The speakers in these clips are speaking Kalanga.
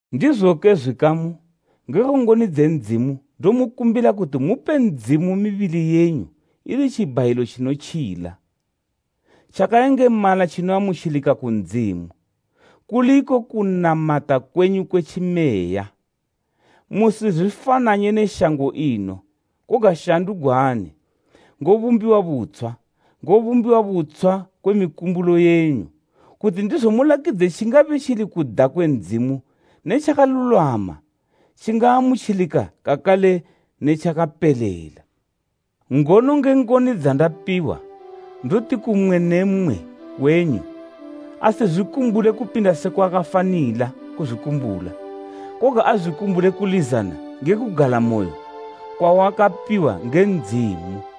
Ndizoke, zwikamu, ngekwe ngoni dze Ndzimu ndomukumbila kuti mupe Ndzimu mibili yenyu ili tjibhayilo tjinotjila, tjakayengemala tjinoamutjilika ku Ndzimu, kuli iko kunamata kwenyu kwe Tjimeya. Musizwifananye ne shango ino, koga shandugwani ngobumbiwa butshwa, ngobumbiwa butshwa kwe mikumbulo yenyu, kuti ndizo mulakidze tjingabe tjili kuda kwe Ndzimu ne tjakalulwama tjingaamutjilika kakale ne tjakapelela. Ngono nge ngoni dzandapiwa ndoti ku mmwe ne mmwe wenyu, asizwikumbule kupinda sekwa akafanila kuzwikumbula. Koga azwikumbule kulizana nge kugalamoyo kwawakapiwa nge Ndzimu.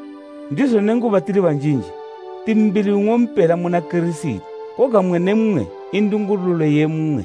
Ndizo nenguba tili banjinji, ti mbili nng'ompela muna Kirisiti, koga mmwe ne mmwe i ndungululo ye mmwe.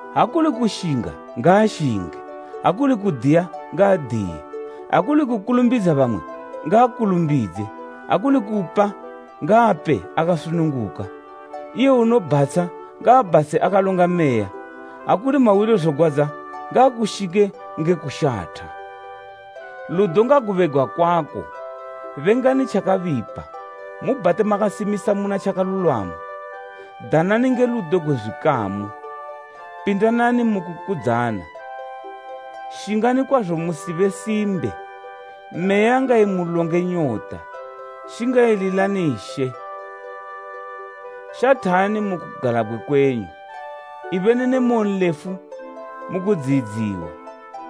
ha kuli kushinga, ngaashinge; ha kuli kudiya, ngaadiye; ha kuli kukulumbidza bamwe, ngaakulumbidze; ha kuli kupa ngaape akasununguka; iye unobhatsha, ngaabhatshe akalonga meya; ha kuli mahwilozogwadza ngaakushinge nge kushatha. Ludo ngagube gwakwako. Bengani tjakabipa, mubhate makasimisa muna tjakalulwama. Danani nge ludo gwe zwikamu, pindanani mu kukudzana. Shingani kwazo musibe simbe. Meya ngaimulonge nyota, shingayililani She. Shathani mu kugalabgwe kwenyu, ibeni ne moyonlefu mu kudziyidziwa,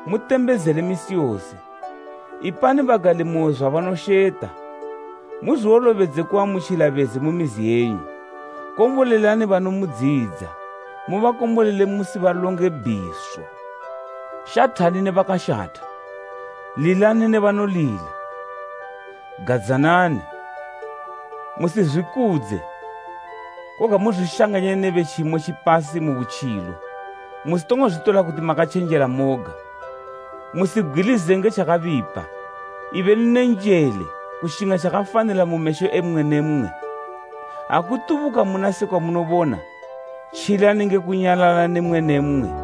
mutembezele misi yose. Ipani bagalimoyo zwabanosheta, muzwiwolobedze kuamutjila bezi mu mizi yenyu. Kombolelani banomudziyidza, mubakombolele musibalonge bhiso. Shathani ne bakashatha, lilani ne banolila. Gadzanani; musizwikudze, koga muzwishanganye ne be tjimo tjipasi mu butjilo, musitongo zwitola kuti makatjenjela moga. Musibgwilizile nge tjakabipa. Ibeni ne njele kushinga tjakafanila mu mesho e mmwe ne mmwe. Ha kutubuka muna sekwa munobona, tjilani nge kunyalala ne mmwe ne mmwe.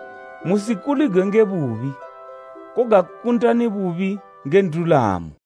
Musikuligwe nge bubi, koga kundani bubi nge ndulamo.